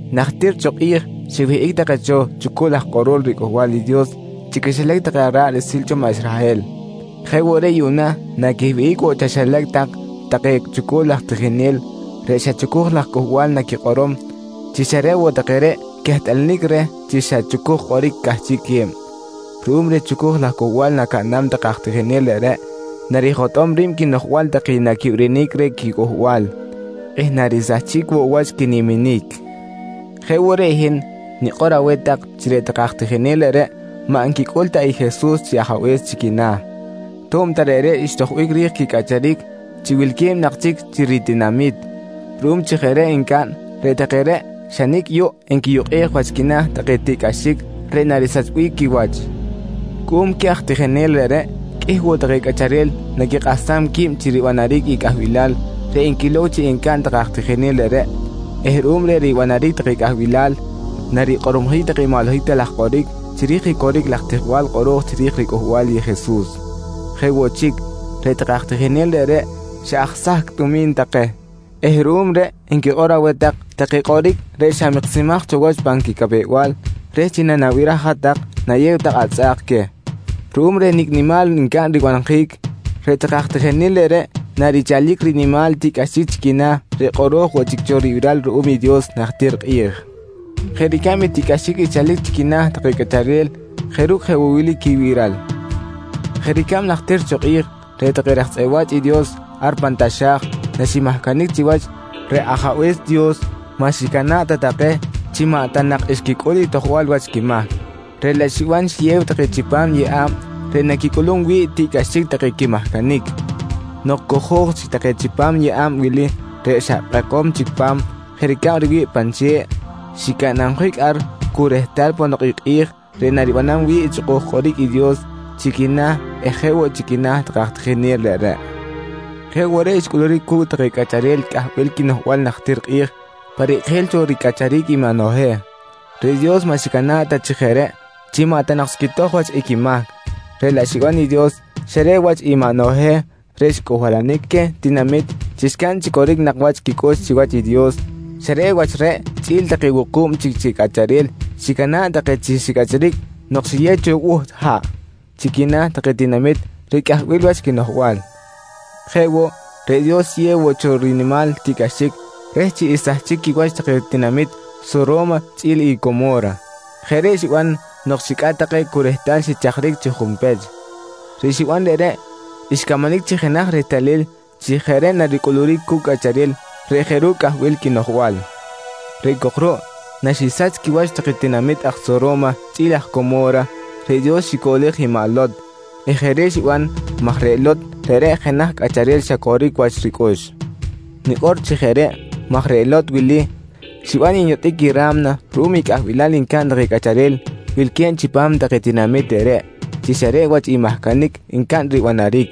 Najtir cho kꞌi̱j xiwihꞌic take cho chucul aj kꞌorol riCꞌuhbal i Dios chi quixilac take ra̱ꞌ riꞌsil cho maꞌ Israhel. Jeꞌ woꞌ reꞌ yuꞌna naquiwihꞌic woꞌ chaxilac tak take chucul aj tijinel reꞌ xa chucuj laj cꞌuhbal naquikꞌorom chi xa reꞌ woꞌ take reꞌ quehtꞌalanic reh chi xa chucuj kꞌoric cꞌahchiꞌque̱b. Ruꞌum reh chucuj laj cꞌuhbal nacaꞌnam take aj tijinel reꞌreꞌ, narijotꞌom ri̱b quinoꞌjbal take naquibirinic reh quicꞌuhbal eh narisahchic woꞌ wach quiniminic. Jeꞌ woꞌ reꞌ hin nikꞌor aweh tak chi reꞌ take aj tijinel reꞌreꞌ maꞌ nquicꞌul ta i Jesus chi Ajabe̱s chi quina̱, to̱b ta reꞌreꞌ xtojbic ri̱j quicꞌacharic chi wilque̱b nak chic chi ritinami̱t. Ruꞌum chi jeꞌ reꞌ ncaꞌn, reꞌ take reꞌ xa nicꞌ yuꞌ nquiyukꞌej wach quina̱ take tiꞌcꞌaxic reꞌ narisachbic quiwach. Cuꞌum queh aj tijinel reꞌreꞌ qꞌuih woꞌ take cꞌacharel naquikꞌahsam qui̱b chi ribanaric i cꞌahbilal reꞌ enquilow chi ncaꞌn take aj tijinel reꞌreꞌ eh ruꞌum reh ribanaric take cꞌahbilal, narikꞌormojic take i maꞌ holohic ta laj kꞌoric chiri̱j i coric laj tijbal kꞌoro̱j chiri̱j ricꞌuhbal i Jesus. Jeꞌ woꞌ chic, reꞌ take aj tijinel reꞌreꞌ xa aj sahcꞌ tumi̱n take eh ruꞌum reꞌ enquikꞌor aweh tak take kꞌoric reꞌ xa miksimaj cho wach pan quicapew-bal reh chi nanabiraj hat-tak nayew tak atzꞌa̱k queh. Ruꞌum reh nicꞌ nimal ncaꞌn ribanjic, reꞌ take aj tijinel reꞌreꞌ narichalic rinimal tiꞌcꞌaxic chi quina̱ reꞌ kꞌoro̱j woꞌ chic cho ribiral ruꞌum i Dios najtir kꞌi̱j jeꞌ ricab i tiꞌcꞌaxic xchalic chi quina̱ take cꞌacharel jeꞌ ru̱cꞌ jeꞌ woꞌ wili quibiral: Jeꞌ ricab najtir cho kꞌi̱j reꞌ take raj tzꞌeꞌ wa̱ch i Dios ar pan taxa̱j naximahcanic chiwach, reꞌ Ajabe̱s Dios maꞌ xicana̱ꞌ ta take chi maꞌ ta nak xquicꞌul i tojbal wach quimahc, reꞌ laꞌ xiban xiyew take chipam yeꞌa̱b reꞌ naquicꞌulum wi̱ꞌ tiꞌcꞌaxic take quimahcanic. Nok cojo̱j chic take chipam i yeꞌa̱b wili reꞌ xa kꞌekom chic pa̱m jeꞌ ricab riwi̱ꞌ pan che̱ꞌ, xicanabjic ar cu rehtal ponok i kꞌi̱j reꞌ naribanam wi̱ꞌ i chꞌukuj kꞌoric i Dios chi quina̱ eh jeꞌ woꞌ chi quina̱ take aj tijinel reꞌreꞌ. Jeꞌ woꞌ reꞌ xcꞌuluric cu̱cꞌ take cꞌacharel cꞌahbil quinoꞌjbal najtir kꞌi̱j pa rikꞌijil cho ricꞌacharic i maꞌ Noheh. Reꞌ Dios maꞌ xicana̱ꞌ ta chi jeꞌ reꞌ chi maꞌ ta nak xquitoj wach i quimahc, reꞌ laꞌ xiban i Dios xa reꞌ wach i maꞌ Noheh reꞌ xcꞌuhbalanic queh tinamit chi xcaꞌn chi coric nak wach quicꞌux chiwach i Dios, xa reꞌ wach reꞌ chꞌi̱l take wuku̱b chic chi cꞌacharel xicana̱ꞌ take chi xicꞌacharic nok xiyew cho i buht haꞌ chi quina̱ take tinamit reꞌ cꞌahbil wach quinoꞌjbal. Jeꞌ woꞌ, reꞌ Dios xiyew woꞌ cho i rinimal tiꞌcꞌaxic reh chi xsahchic quiwach take tinamit Soro̱ma chꞌi̱l i Como̱ra. Jeꞌ reꞌ xiban nok xicꞌat take cu rehtal xichajric chi junpech. Reꞌ xiban reꞌreꞌ xcamanic chi jenaj rehtalil chi jeꞌ reꞌ naricꞌuluric cu̱cꞌ cꞌacharel reꞌ jeꞌ ru̱cꞌ cꞌahbil quinoꞌjbal. Reꞌ cok ruꞌ, naxisach quiwach take tinamit aj Soro̱ma chꞌi̱l aj Como̱ra, reꞌ Dios xicoꞌlej i maꞌ Lot eh jeꞌ reꞌ xiban maj reꞌ Lot reꞌreꞌ jenaj cꞌacharel xa coric woꞌ wach ricꞌux. Nikꞌor chi jeꞌ reꞌ maj reꞌ Lot wili xiban nyotꞌic i ra̱mna ruꞌum i cꞌahbilal ncaꞌn take cꞌacharel wilque̱b chipam take tinamit reꞌreꞌ chi xa reꞌ wach i mahcanic ncaꞌn ribanaric.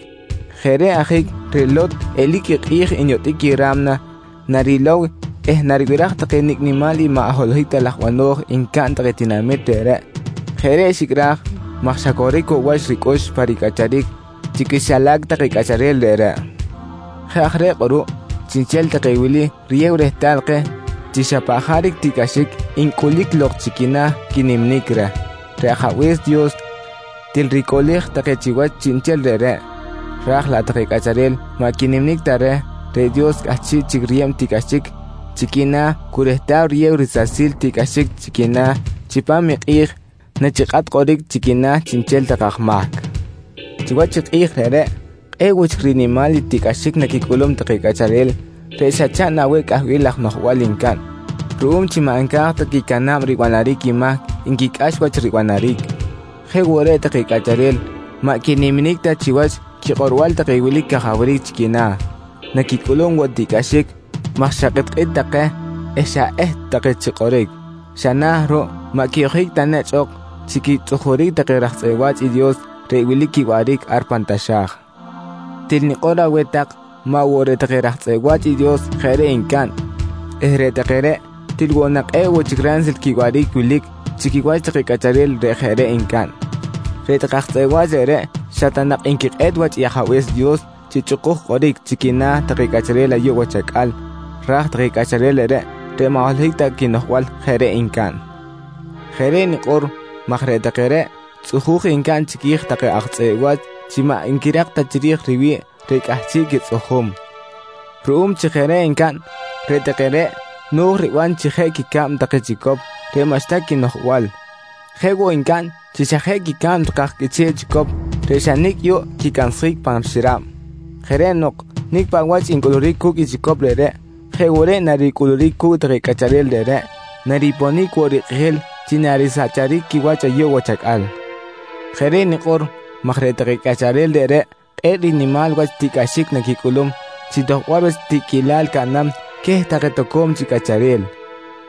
Jeꞌ reꞌ ajic reꞌ Lot eli̱c i kꞌi̱j nyotꞌic i ra̱mna narilow eh naribiraj take nicꞌ nimal i maꞌ holohic ta laj bano̱j ncaꞌn take tinamit reꞌreꞌ. Jeꞌ reꞌ xicꞌraj maj xa coric woꞌ wach ricꞌux pa ricꞌacharic chi quixilac take cꞌacharel reꞌreꞌ. Jeꞌ aj reꞌ kꞌuruꞌ chiꞌnchel take wili riyew rehtal keh chi xa paꞌ jaric tiꞌcꞌaxic ncꞌulic lok chi quina̱ take quiniminic reh, reꞌ Ajabe̱s Dios til ricoꞌlej take chiwach chiꞌnchel reꞌreꞌ, ra̱j laꞌ take cꞌacharel maꞌ quiniminic ta reh, reꞌ Dios cꞌahchiꞌ chic riyeb tiꞌcꞌaxic chi quina̱ cu rehtal riyew risasil tiꞌcꞌaxic chi quina̱ chipam i kꞌi̱j nachikꞌat kꞌoric chi quina̱ chiꞌnchel take aj mahc. Chiwach i kꞌi̱j reꞌreꞌ, kꞌe̱ꞌ woꞌ chic rinimal i tiꞌcꞌaxic naquicꞌulum take cꞌacharel reꞌ xa chaꞌn aweh cꞌahbil laj noꞌjbal ncaꞌn ruꞌum chi maꞌ nca̱j ta quicana̱b ribanaric i mahc nquicꞌax wach ribanaric. Jeꞌ woꞌ reꞌ take cꞌacharel maꞌ quiniminic ta chiwach quikꞌorbal take wilic cajawric chi quina̱, naquicꞌulum woꞌ tiꞌcꞌaxic maj xa kꞌitkꞌit take eh xa eht take chi kꞌoric. Xa na̱ ruꞌ maꞌ quiyoꞌjic ta nechꞌ ok chi quitzꞌujuric take raj tzꞌeꞌ wa̱ch i Dios reꞌ wilic quiwaꞌric ar pan taxa̱j. Til nikꞌor aweh tak maꞌ woꞌ reꞌ take raj tzꞌeꞌ wa̱ch i Dios jeꞌ reꞌ ncaꞌn eh reꞌ take reꞌ til woꞌ nak kꞌe̱ꞌ woꞌ chic ransil quiwaꞌric wilic chi quiwach take cꞌacharel reꞌ jeꞌ reꞌ ncaꞌn. Reꞌ take aj tzꞌeꞌ wa̱ch reꞌreꞌ xa ta nak nquikꞌet wach i ajabe̱s Dios chi chꞌukuj kꞌoric chi quina̱ take cꞌacharel ayuꞌ wach acꞌal raj take cꞌacharel reꞌreꞌ, reꞌ maꞌ holohic ta quinoꞌjbal jeꞌ reꞌ ncaꞌn. Jeꞌ reꞌ nikꞌor maj reꞌ take reꞌ tzꞌuju̱j ncaꞌn chiqui̱j take aj tzꞌeꞌ wa̱ch chi maꞌ nquirak ta chiri̱j riwi̱ꞌ reꞌ cꞌahchiꞌ quitzꞌujum. Ruꞌum chi jeꞌ reꞌ ncaꞌn, reꞌ take reꞌ no̱j riban chi jeꞌ quicab take chicop reꞌ maꞌxta quinoꞌjbal. Jeꞌ woꞌ ncaꞌn chi xa jeꞌ quicab take aj qꞌuiche̱ꞌ chicop reꞌ xa nicꞌ yuꞌ quicansjic pan xirab. Jeꞌ reꞌ nok nicꞌ paꞌ wach ncꞌuluric cu̱cꞌ i chicop reꞌreꞌ, jeꞌ woꞌ reꞌ naricꞌuluric cu̱cꞌ take cꞌacharel reꞌreꞌ nariponic woꞌ rikꞌijil chi narisacharic quiwach ayuꞌ wach acꞌal. Jeꞌ reꞌ nikꞌor maj reꞌ take cꞌacharel reꞌreꞌ kꞌe̱ꞌ rinimal wach tiꞌcꞌaxic naquicꞌulum chi tojbal wach tiꞌquilal caꞌnam queh take toco̱m chic cꞌacharel.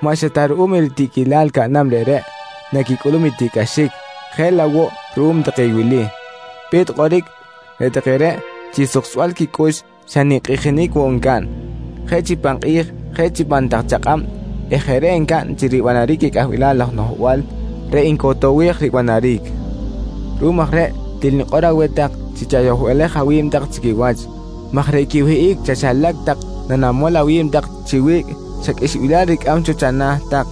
Maꞌ xa ta ruꞌum i tiꞌquilal caꞌnam reꞌreꞌ naquicꞌulum i tiꞌcꞌaxic, jeꞌ laꞌ woꞌ ruꞌum take i wili: Pe̱t kꞌoric, reꞌ take reꞌ chi suksbal quicꞌux xa ninkꞌijinic woꞌ ncaꞌn, jeꞌ chi pan kꞌi̱j jeꞌ chi pan tak chakꞌab eh jeꞌ reꞌ ncaꞌn chi ribanaric i cꞌahbil laj noꞌjbal reꞌ ncotowej ribanaric. Ruꞌum aj reꞌ til nikꞌor aweh tak chi chayohbalej awi̱b tak chi quiwach maj reꞌ quiwihꞌic chaxilac tak nanamol awi̱b tak chi wiꞌc xa qꞌuixbilal ricꞌam cho chana̱ tak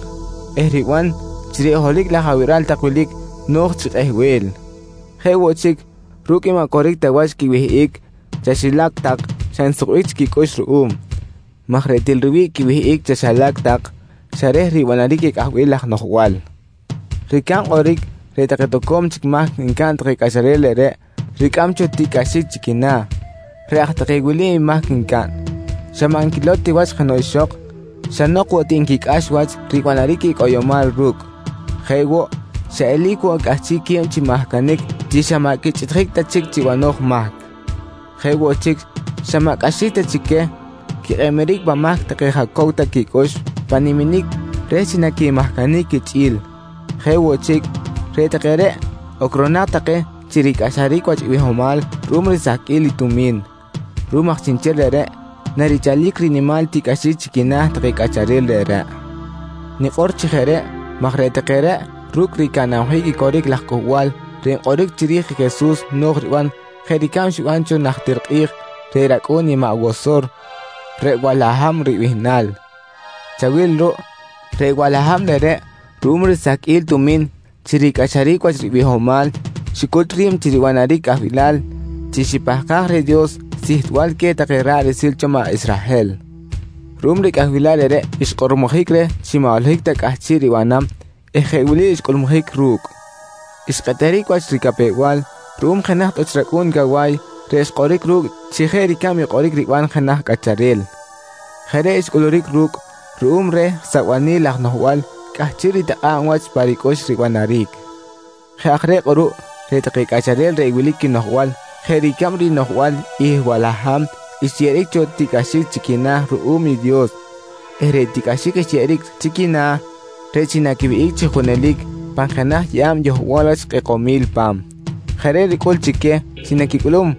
eh riban chi reꞌ holohic laj abiral tak wilic no̱j chi kꞌehbel. Jeꞌ woꞌ chic, ru̱cꞌ i maꞌ coric ta wach quiwihꞌic chaxilac tak xa nsukbic chic quicꞌux ruꞌum, maj reꞌ til riwi̱ꞌ quiwihꞌic chaxilac tak xa reh ribanaric i cꞌahbil laj noꞌjbal. Ricab kꞌoric, reꞌ take toco̱m chic mahc ncaꞌn take cꞌacharel reꞌreꞌ, ricꞌam cho tiꞌcꞌaxic chi quina̱. Reꞌ aj take wili i mahc ncaꞌn: Xa maꞌ nquilow ti wach jenoꞌ ixok, xa nok woꞌ ti nquicꞌax wach ribanaric i cꞌoyomal ru̱cꞌ. Jeꞌ woꞌ, xa eli̱c woꞌ cꞌahchiꞌque̱b chi mahcanic chi xa maꞌ quichꞌiꞌtjic ta chic chi banoj mahc. Jeꞌ woꞌ chic, xa maꞌ cꞌaxic ta chi queh quikꞌeb-eric pan mahc take jaꞌ cow ta quicꞌux pan niminic reh chi naquimahcanic quichꞌi̱l. Jeꞌ woꞌ chic, reꞌ take reꞌ ocronak take chi ricꞌaxaric wach i bihomal ruꞌum risahqꞌuil i tumi̱n. Ruꞌum aj chiꞌnchel reꞌreꞌ narichalic rinimal tiꞌcꞌaxic chi quina̱ take cꞌacharel reꞌreꞌ. Nikꞌor chi jeꞌ reꞌ maj reꞌ take reꞌ ru̱cꞌ ricanabjic i coric laj cꞌuhbal reꞌ nkꞌoric chiri̱j i Jesus no̱j riban jeꞌ ricab xiban cho najtir kꞌi̱j reꞌ racꞌu̱n i maꞌ Wosor, reꞌ Walaham ribihnal. Chawil ruꞌ reꞌ Walaham reꞌreꞌ ruꞌum risahqꞌuil tumi̱n chi ricꞌaxaric wach ribihomal xicut ri̱b chi ribanaric cꞌahbilal chi xipahkaj reh Dios sihtbal queh take ra̱ꞌ riꞌsil cho maꞌ Israhel. Ruꞌum reh cꞌahbilal reꞌreꞌ xkꞌormojic reh chi maꞌ holohic ta cꞌahchiꞌ ribanam eh jeꞌ wili xcꞌulmujic ru̱cꞌ: Xkꞌeteric wach ricapew-bal ruꞌum jenaj tꞌuch racꞌu̱n cawa̱y reꞌ xkꞌoric ru̱cꞌ chi jeꞌ ricab i kꞌoric riban jenaj cꞌacharel. Jeꞌ reꞌ xcꞌuluric ru̱cꞌ ruꞌum reh sabanil laj noꞌjbal cꞌahchiꞌ ritikꞌa̱b wach pa ricꞌux ribanaric. Jeꞌ aj reꞌ kꞌuruꞌ reꞌ take cꞌacharel reꞌ wilic quinoꞌjbal jeꞌ ricab rinoꞌjbal i Walaham xyeꞌeric cho tiꞌcꞌaxic chi quina̱ ruꞌum i Dios eh reꞌ tiꞌcꞌaxic xyeꞌeric chi quina̱, reꞌ chi naquiwihꞌic chi junelic pan jenaj yeꞌa̱b yohbal wach kꞌekomil pa̱m. Jeꞌ reꞌ ricꞌul queh chi naquicꞌulum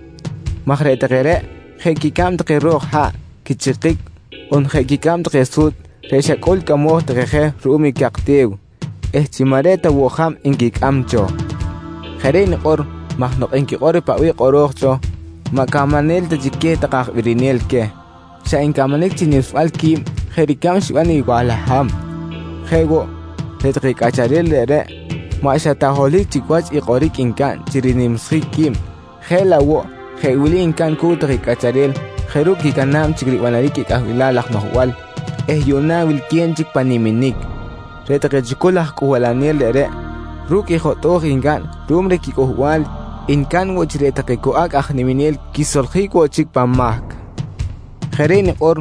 maj reꞌ take reꞌ jeꞌ quicab take ro̱k haꞌ quichikic on jeꞌ quicab take su̱tzꞌ reꞌ xa cꞌul cꞌamoj take je ruꞌum i cak te̱w eh chi maꞌ reꞌ ta woꞌ jab nquicꞌam cho. Jeꞌ reꞌ nikꞌor maj nok nquikꞌor i paꞌ bih kꞌoro̱j cho, maꞌ camanel ta chi queh take aj birinel queh, xa ncamanic chi nimsbal qui̱b jeꞌ ricab xiban i Walaham. Jeꞌ woꞌ, reꞌ take cꞌacharel reꞌreꞌ maꞌ xa ta holohic chic wach i kꞌoric ncaꞌn chi rinimsjic qui̱b jeꞌ laꞌ woꞌ jeꞌ wili ncaꞌn cu̱cꞌ take cꞌacharel jeꞌ ru̱cꞌ quicana̱b chic ribanaric i cꞌahbil laj noꞌjbal eh yuꞌna wilque̱b chic pan niminic: Reꞌ take chucul aj cꞌuhbalanel reꞌreꞌ ru̱cꞌ i jotꞌo̱j ncaꞌn ruꞌum reh quicꞌuhbal ncaꞌn woꞌ chi reꞌ take cu acꞌ aj niminel quisoljic woꞌ chic pan mahc. Jeꞌ reꞌ nikꞌor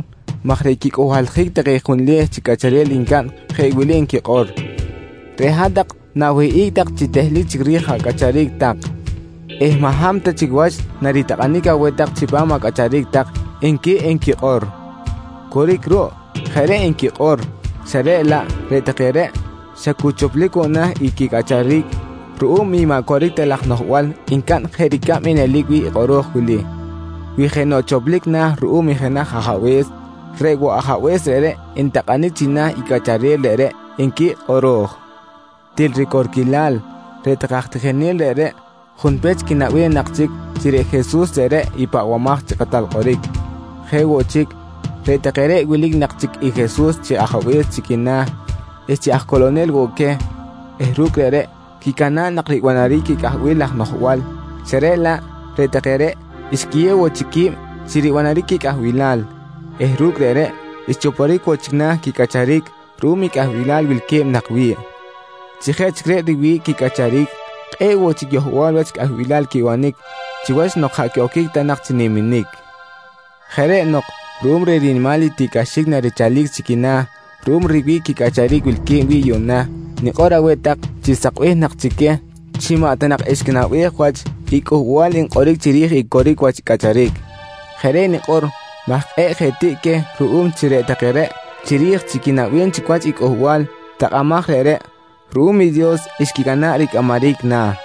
maj reꞌ quicꞌuhbaljic take junleh chic cꞌacharel ncaꞌn jeꞌ wili nquikꞌor: «Reꞌ hat-tak na̱wihꞌic tak chi tehlic chic ri̱j acꞌacharic tak eh maꞌ hab ta chic wach naritakꞌanic aweh tak chipam acꞌacharic tak, nqui nquikꞌor. Coric ruꞌ jeꞌ reꞌ nquikꞌor xa reꞌ laꞌ reꞌ take reꞌ xa cu choplic woꞌ na̱ i quicꞌacharic ruꞌum i maꞌ coric ta laj noꞌjbal ncaꞌn jeꞌ ricab i nelic wi̱ꞌ i kꞌoro̱j wili: «Wi jenoꞌ choplic na̱ ruꞌum i jenaj ajabe̱s, reꞌ woꞌ ajabe̱s reꞌreꞌ ntakꞌanic china̱ i cꞌacharel reꞌreꞌ, nqui kꞌoro̱j. Til ricorquilal reꞌ take aj tijinel reꞌreꞌ junpech quinaꞌbem nak chic chi reꞌ Jesus reꞌreꞌ i Pahbamaj chi Kꞌatal Kꞌoric. Jeꞌ woꞌ chic, reꞌ take reꞌ wilic nak chic i Jesus chi Ajabe̱s chi quina̱ eh chi aj coꞌlonel woꞌ queh eh ru̱cꞌ reꞌreꞌ quicana̱ꞌ nak ribanaric i cꞌahbil laj noꞌjbal xa reꞌ laꞌ reꞌ take reꞌ xquiyew woꞌ chic qui̱b chi ribanaric i cꞌahbilal eh ru̱cꞌ reꞌreꞌ xchoporic woꞌ chic na̱ quicꞌacharic ruꞌum i cꞌahbilal wilque̱b nak wi̱ꞌ. Chi jeꞌ chic reꞌ riwi̱ꞌ quicꞌacharic, kꞌe̱ꞌ woꞌ chic yohbal wach cꞌahbilal quibanic chiwach nok jaꞌ quiꞌoquic ta nak chi niminic! Jeꞌ reꞌ nok ruꞌum reh rinimal i tiꞌcꞌaxic narichalic chi quina̱ ruꞌum riwi̱ꞌ quicꞌacharic wilque̱b wi̱ꞌ yuꞌna, nikꞌor aweh tak chi sakbih nak chi queh chi maꞌ ta nak xquinaꞌbej wach i cꞌuhbal nkꞌoric chiri̱j i coric wach cꞌacharic. Jeꞌ reꞌ nikꞌor maj kꞌe̱ꞌ je tiꞌ queh ruꞌum chi reꞌ take reꞌ chiri̱j chi quinaꞌbem chic wach i cꞌuhbal takꞌamaj reꞌreꞌ ruꞌum i Dios xquicana̱ꞌ ricꞌamaric na̱.